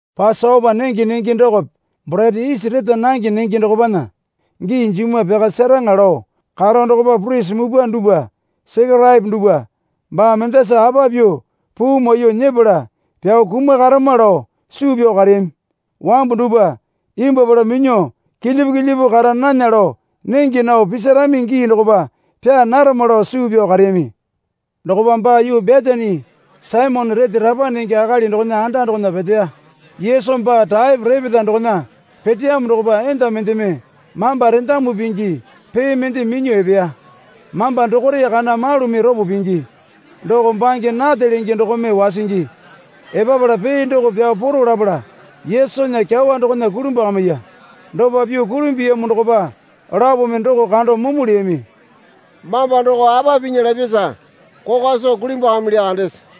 Pasopa nenge nenge dokope borete isi reta nange nenge dokopana gii jimwa pyaka seraŋa lao karo dokopa purisi mupwa dupwa Sekeraepo dupwa, Baa mendasa apa pyuo puu maiyuo nyepala pyao kumakarama lao suu pyao kareyami. Wambu dupwa imbwuapala minyuo kilyipu kilyipu kara nana lao nenge nao pisirami gii dokopa pyaa narama, lao suu pyao kareyami. Dokopa baa yuu Betani Saimone rete rapa nenge akali dokona anda dokona peteya. Yesu baa raepo repeta dokona peteyamo dokopa enda mendeme mamba rendamu pingi pee mende minyuo epeya. Mamba dokore kana malumi ropo pingi doko bange nate lenge dokome wasingi. Epapala pee doko pyao poro lapala Yesunya kyawa dokona kulimbwakamiya. Dopa pyuo kulimbuyamo dokopa lapome doko kando mumu leyami. Mamba doko apa pinya lapyasa kokwa soo kulimbwakamilya kandese?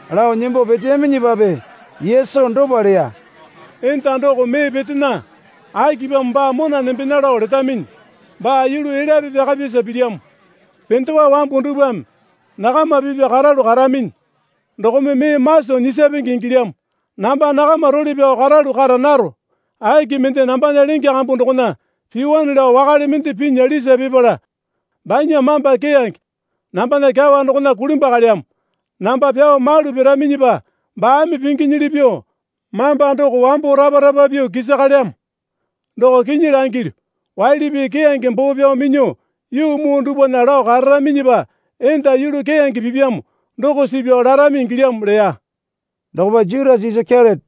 Lao nembo peteyaminyipape Yesu dopa leya. Enda doko mee petena. Akipamo baa mona nembena lao letaminyi? Baa yulu elyape pyakapyasa pilyamo. Pendewa wambu dupwame nakama pipya karalu karaminyi, dokome mee maso nyisapenge ingilyamo. Namba nakama role pyao karalu kara naro. Aki mende nambana lenge kambu dokona piwane lao wakale mende pinya lisa pipala banya mamba keyange nambana kyawa dokona kulimbwakalyamo. Namba pyao malu piraminyipa baame pinginyili pyuo mamba doko wambo rapa rapa pyuo kisakalyamo. Doko kinyi langilyu, waili pii keyange boo pyao minyuo yuu muu dupwana lao kararaminyipa enda yulu keyange pipyamo doko suu pyao larami ingilyamo leya. Dokopa Jutasa Isakeriote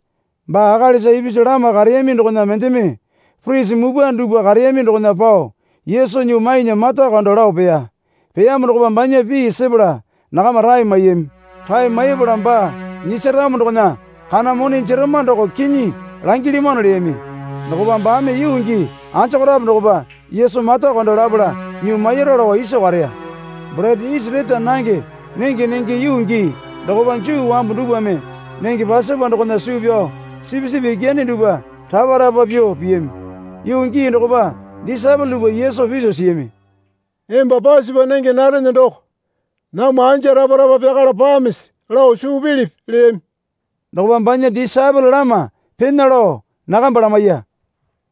baa akalisa ipisu lama kareyami dokona mendeme, purisi mupwa dupwa kareyami dokona pao Yesu nyuo mainya mata kando lao peya. Peyamo dokopa banya pii sepala nakama rae maiyami. Rae maipala baa nyisaramo dokona kana mone jerama doko kinyi langilyamano, leyami. Dokopa baame yuu gii anjokorape dokopa Yesu mata kando lapala nyuo mairu lao iso kareya. Borete isi reta nange nenge nenge yuu gii dokopa Juu wambu dupwame nenge Pasopa dokona suu pyao sipisipi yakane dupwa rapa rapa pyuo piyami. Yuu gii dokopa disaepole dupwa Yesu piso siyami. Emba Pasopa nenge narene doko namwa anja rapa rapa pyakala pamisi lao suu pilipi? leyami. Dokopa banya disaepole lama pena lao nakamba lamaiya.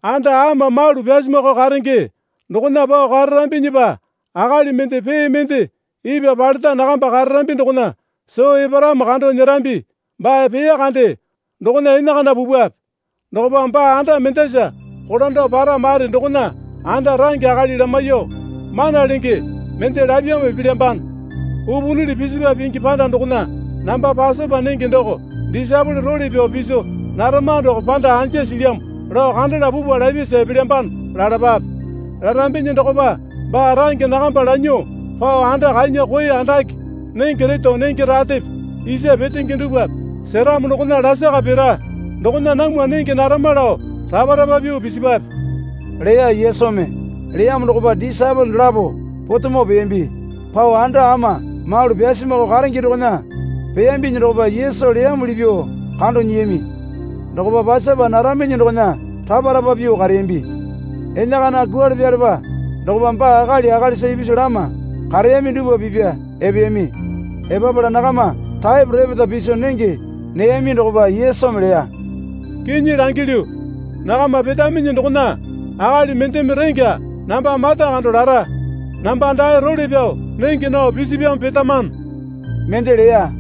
Anda ama malu pyasumako karenge dokona pao kararambinyipa akali mende pee mende ipwa paleta nakamba kararambi dokona soo eparamo kando nyerambi baa peya kande dokona enakana pupwape. Dokopa baa anda mendasa kolando para mare dokona anda range akali lamaiyuo, Mana Lenge mende lapyamo epelyambano. Upunili pisipa pingi panda dokona namba Pasopa nenge doko disaepole role pyao piso narama doko panda anja silyamo lao kandala pupwa, lapyasa epelyambano, lalapape. Larambinyi dokopa baa range nakamba lanyuo pao anda kanya koe andake nenge reto nenge ratepe isa petenge dupwape seramo dokona lakara pira. Dokona namwa nenge narama lao rapa rapa pyuo pisipwape, leya Yesumi. Leyamo dokopa disaepole dolapo potemo peyambi. Pao anda ama malu pyasumako karenge dokona peyambinyi dokopa Yesu leyamuli pyuo kando nyiyami. Dokopa Pasopa naraminyi dokona rapa rapa pyuo kareyambi. Enakana kwualepalepa dokopa baa akali akalisa ipisu lama kareyami dupwa pipya epeyami. Epapala nakama raepo repeta piso nenge neyami dokopa Yesu leya. Kinyi langilyu, nakama petaminyi dokona akali mendeme rengya namba mata kando lara. Namba dae role pyao nenge nao pisipyamo petamano, mende leya.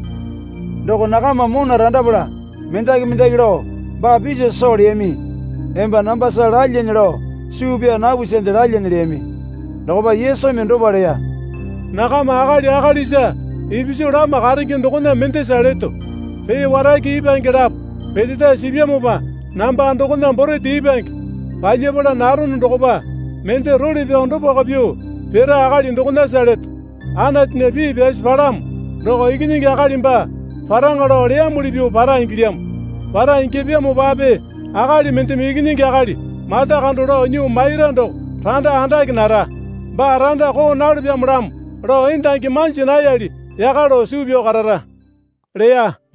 Doko nakama mona randapala mendaki mendaki lao baa piso soo leyami. Emba nambasa lalyane lao suu pyaa napusande lalyane leyami. Dokopa Yesumi dopa leya. Nakama akali akalisa ipisu lama karenge dokona mendasa leto. Pee warake ipwange lapo peteta sipyamopa namba dokona borete ipwange palyapala narono dokopa mende role pyao dopako pyuo pira akali dokonasa leto. Anatunya pii pyasi palamo doko Ikinyingi Akali baa paraŋa lao leyamuli pyuo para ingilyamo. Para ingyapyamopape akali mendeme Ikinyingi Akali mata kando lao nyuo maira doko randa andake nara. Baa randa koo nalopyamolamo lao endangi manja nayali yaka lao suu pyao karara leya.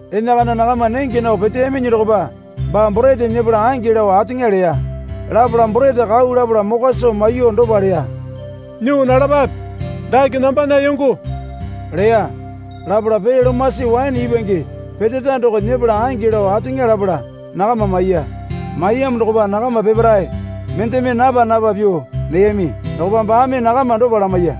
Enakana nakama nenge nao peteyaminyi dokopa baa borete nyepala ange lao ateŋa leya. Lapala borete kau lapala mokwa soo maiyuo dopa leya. Nyuo nalapape. Dake nambana yongo, leya. Lapala pee lomasi waene ipwange peteta doko nyepala ange lao ateŋa lapala nakama maiya. Maiyamo dokopa nakama peparae mendeme napa napa pyuo neyami. Dokopa baame nakama dopa lamaiya.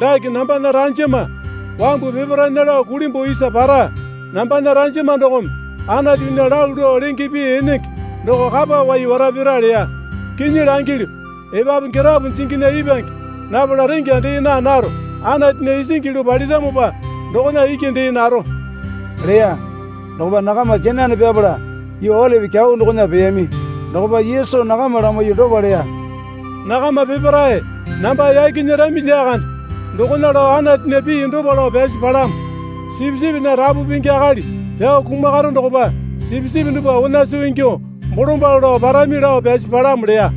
Dake nambana ranjama wambu peparaena lao kulimbuo isa para. Nambana ranjama dokome Anatunya lalu lao lenge pii enenge doko kapa wai wara pira leya. Kinyi langilyu, epapu girapo jinginya ipwange napala rengya dee naa naro. Anatunya isingi yulu paliramopa dokona iki dee naro, leya. Dokopa nakama kenane pyapala yuu Olipi Kyau dokona peyami. Dokopa Yesu nakama lamaiyuo dopa leya. Nakama peparae namba yaki nyerami lyakande. Dokona lao Anatunya pii dopa lao pyasi palamo. Sipisipinya rapu pingi akali pyao kumakaro dokopa sipisipi dupwa onasu ingyuo bolombalo lao parami, lao pyasi palamo leya.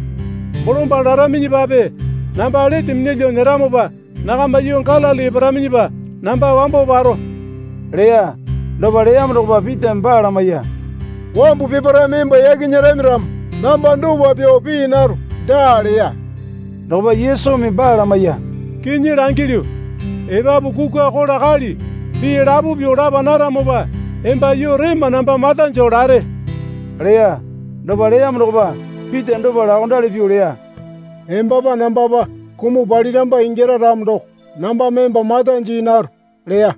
Bolombalo laraminyipape namba lete minyalyuo nyeramopa nakama yuu Galili eparaminyipa namba wambo paro, leya. Dopa leyamo dokopa Pitame baa lamaiya. Wambu peparaeme emba yaki nyerami ramo namba dopa pyuo pii naro, daa leya. Dokopa Yesumi baa lamaiya. Kinyi langilyu, epapu kukwa kola kali pii lapo pyuo lapa naramopa emba yuu rema namba mata joo lare, leya. Dopa leyamo dokopa Pita dopa laokondali pyuo leya. Embapa nambapa kumuo paramba ingyara ramo doko nambame emba mata jii naro, leya.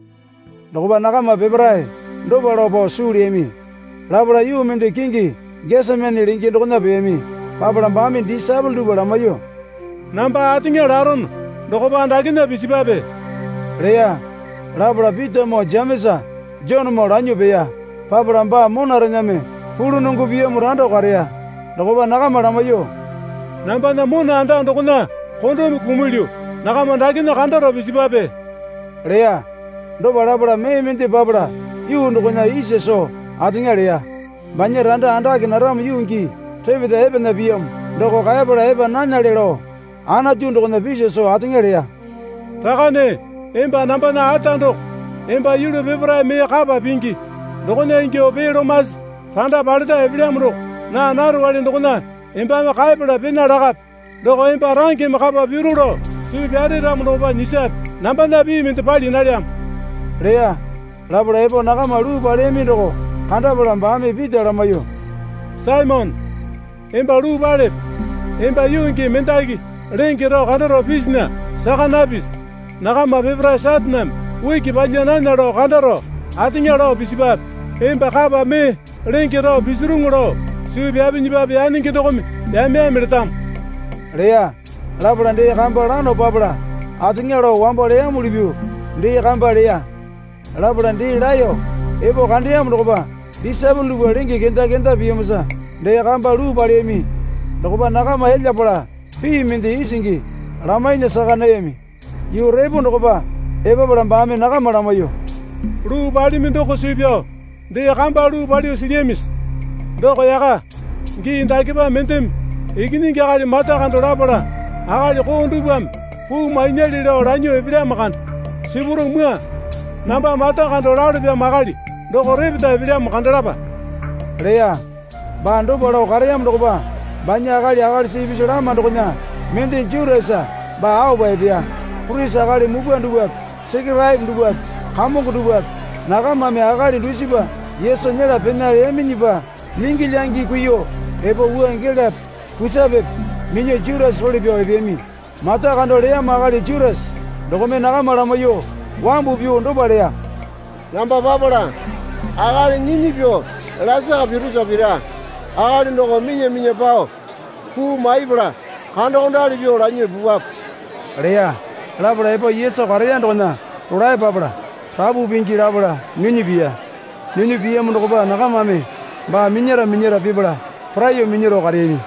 Dokopa nakama peparae dopa lao pao suu leyami. Lapala yuu mende kingi Gesemani lenge dokona peyami. Papala baame disaepole dupwa lamaiyuo, Namba ateŋa larono dokopa dakena pisipwape, leya. Lapala Pitamoo Jemesa Jonemoo lanyo peya. Papala baa monarename pulunongo piyamo rando kareya. Dokopa nakama lamaiyuo, Nambana mona anda dokona kondome kumulyu. Nakama dakena kandaro pisipwape, leya. Dopa lapala mee mende papala yuu dokona isa soo ateŋa leya. Banya randa andake naramo yuu gii repeta epena piyamo doko kaepala epa nanale lao Anatu dokona piso soo ateŋa leya. Rakane emba nambana Ata doko, emba yulu peparae mee kapa pingi. Dokona ingyuo pee lomasi randa paleta epelyamo doko naa narowale dokona embame kaepala pena lakape. Doko emba rangeme kapa piru lao suu pyare ramo dokopa nyisape. Nambana pii mende pali nalyamo, leya. Lapala epo nakama luu paleyami doko kandapala baame Pita lamaiyuo, Saimone, emba luu palepe? Emba yuu gii mendaki lenge rao kandaro pisinya saka napisi? Nakama peparae Sataneme uki palya nana lao kandaro ateŋa lao pisipwape. Emba kapa mee lenge rao pisirunu lao suu pyapinyipape yanenge dokome yame yame letamo, leya. Lapala dee kamba lano papala ateŋa lao wambo leyamuli pyuo dee kamba leya. Lapala dee laeyo epo kandeyamo dokopa disaepole dupwa lenge kenda kenda piyamosa dee kamba luu paleyami. Dokopa nakama elyapala pii mende isingi lamainya saka nayami. Yuu repo dokopa epapala baame nakama lamaiyuo, Luu palimi doko suu pyao dee kamba luu palo silyamisi? doko yaka. Gii dakepa mendeme Ikinyingi Akali mata kando lapala akali koo dupwame puu mainyale lao lanyuo epelyamo kande. Sipuro mwua. Namba mata kando lalopyamo akali doko repeta epelyamo kandalapa, leya. Baa dopa lao kareyamo dokopa banya akali akalisa ipisu lama dokona mende Jutasa baa aopa epeya. Purisi akali mupwa dupwape Sekeraepo dupwape kamongo dupwape nakamame akali dusipa Yesu nyela pena leyaminyipa lyingi lyangi kuiyuo epo wua gelape kusapepe minyuo Jutasa role pyao epeyami. Mata kando leyamo akali Jutasa dokome nakama lamaiyuo wambu pyuo dopa leya. Namba papala akali nyinyi pyuo lasaka pirosa pira. Akali doko minya minya pao puu maiyapala kandokondali pyuo lanyuo pupwape, leya. Lapala epo Yesu kareya dokona rolae papala, Rapu Pingi, lapala nyinyi piya. Nyinyi piyamo dokopa nakamame baa minyara minyara pipala poraiyuo minyaro kareyami.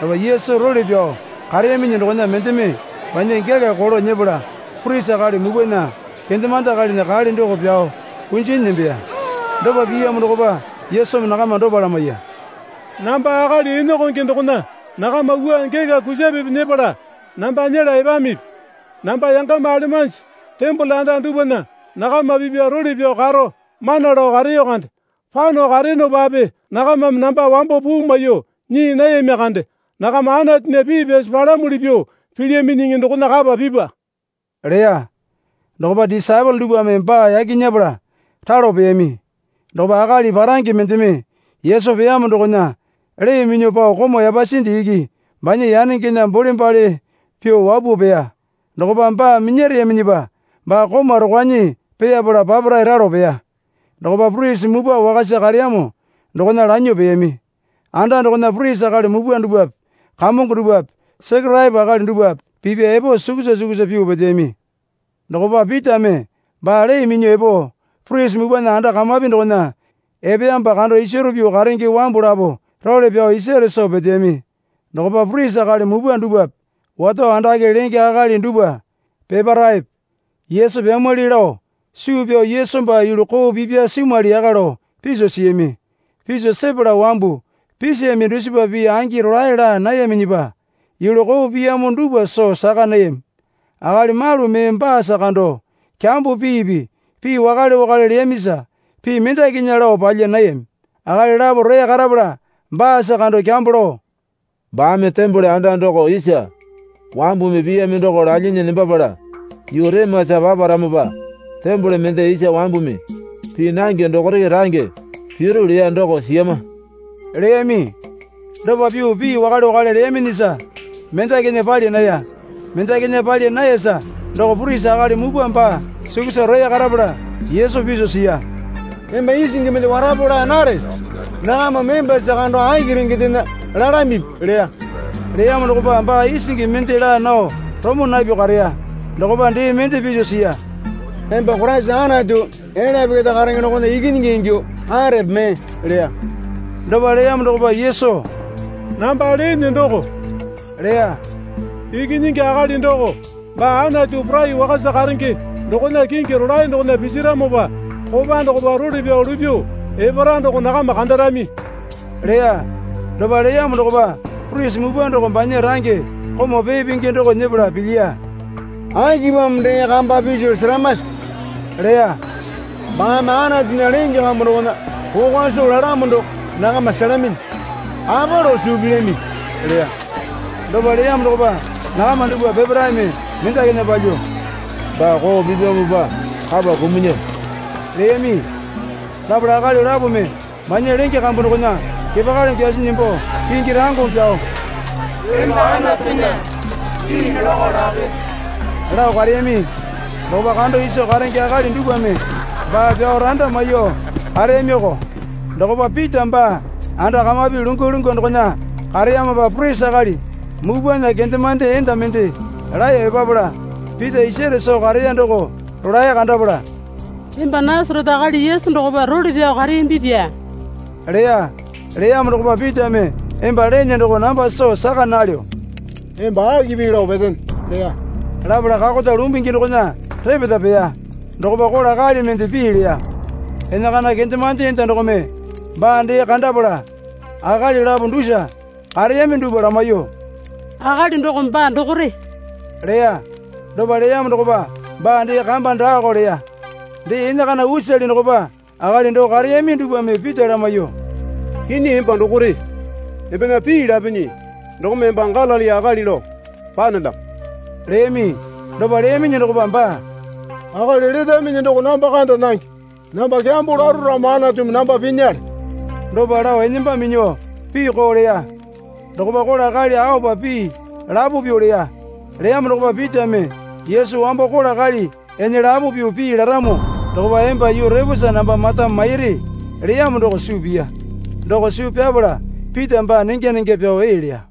Dokopa Yesu role pyao kareyaminyi dokona mendeme banya gela kolo nyepala purisi akali mupwana kendemande akalinya kale doko pyao kunjinyi nembeya. Dopa piyamo dokopa Yesumi nakama dopa lamaiya. Namba akali enakonge dokona nakama wua gela kusapepe nyepala namba nyela epamipi? Namba yangama alemanji tembole anda dupwana nakama pipya role pyao karo mana lao kareyo kande. Pano kareyonopape nakamame namba wambo puu maiyuo nyii nayami kande. Nakama Anatunya pii pyasi palamuli pyuo pilyaminyiŋi dokona kapa pipwa, leya. Dokopa disaepole dupwame baa yaki nyepala ralo peyami. Dokopa akali parange mendeme Yesu peyamo dokona lee minyuo pao komau yapasinde iki banya yanengena bole bale pyuo wapuo peya. Dokopa baa minyareyaminyipa baa komau rokwanyi peyarala papara ralo peya. Dokopa purisi mupwa wakasa kareyamo dokona lanyuo peyami. Anda dokona purisi akali mupwa dupwape kamongo dupwape Sekeraepo akali dupwape pipya epo sukusa sukusa pyuo peteyami. Dokopa Pitame baa lee minyuo epo purisi mupwana anda kamapi dokona epeyamopa kando isaro pyuo karenge wambu lapo role pyao isare soo peteyami. Dokopa purisi akali mupwa dupwape wato andake lenge akali dupwa peparaepe Yesu pyamwali lao suu pyao Yesu baa yulu koo pipya simwali yaka lao piso siyami. Piso sepala wambu pisiyami dusipa pii angi rolae laa nayaminyipa yulu koo piyamo dupwa soo saka nayami. Akali malu mee baasa kando kyambo piipi pii wakale wakale leyamisa pii mendakinya lao palya nayami. Akali lapo roya karapala baasa kando kyambo lao, Baame tembole anda doko isa wambumi piyami doko lalyinyi nembapala yuu remasa paparamopa tembole mende isa wambumi pii nange dokore range piru leya doko siyama, leyami. Dopa pyuo pii wakale wakale leyaminyisa mendakinya pali naya. Mendakinya pali nayasa doko purisi akali mupwa baa sukusa roya karapala Yesu piso siya. Emba isingi mende warapo laa narese? Nakamame embasa kando aki rengendena lalamipi? leya. Leyamo dokopa baa isingi mende laa nao romo napyuo kareya. Dokopa dee mende piso siya. Emba Koraisa Anatu elyape keta karenge dokona Ikinyingi ingyuo karepe mee? leya. Dopa leyamo dokopa Yesu, Namba lene doko, leya. Ikinyingi Akali doko baa Anatu Porai Wakasa karenge dokona kingi rolae dokona pisaramopa kopa dokopa role pyao lupyuo epara doko nakama kandarami, leya. Dopa leyamo dokopa purisi mupwa doko banya range komau pee pingi doko nyepala pilyiya. Akipamo dee kamba piso seramase? leya. Baame Anatunya lenge kambu dokona kokwa soo lalamo doko nakama selaminyi. Apa lao suu pilyamipi? leya. Dopa leyamo dokopa nakama dupwa peparaeme mendakinya palyuo, Baa koo pipyamopa kapa kumunya, leyami. Lapala akali lapome banya lenge kambu dokona kepakali kyasinyi nembo kingi rangeme pyao, Emba Anatunya pii nolako lape, lao kareyami. Dokopa kando iso karenge akali dupwame baa pyao randa maiyuo kareyamiko. Dokopa Pita baa anda kamapi lungwa lungwa dokona kareyamopa purisi akali mupwana kendemande enda mende laeyo epapala Pita isare soo kareya doko rolae kandapala, Emba Nasarete akali Yesu dokopa role pyao kareyambipya, leya. Leyamo dokopa, Pitame emba lene doko namba soo saka nalyo. Emba aki pii lao petene? leya. Lapala kakota lumbungi dokona repeta peya. Dokopa kola kali mende pii leya. Enakana kendemande enda dokome baa dee kandapala akali lapo dusa kareyami dupwa lamaiyuo, Akali doko baa dokore, leya. Dopa leyamo dokopa baa dee kamba daako leya. Dee enakana usale dokopa akali doo kareyami dupwame Pita lamaiyuo, kinyi emba dokore. Embena pii lapinyi dokome emba Galili akali lao panelyamo, leyami. Dopa leyaminyi dokopa baa, Akali letaminyi doko namba kanda nange. Namba kyambo laro ramo Anatumi namba pinyale, dopa lao enamba minyuo pii koo leya. Dokopa kola kali aopa pii lapo pyuo leya. Leyamo dokopa Pitame Yesu, Wambo kola kali ene lapo pyuo pii laramo dokopa emba yuu reposa namba mata mairi, leyamo doko suu piya. Doko suu pyapala Pita baa nenga nenga pyao ee leya.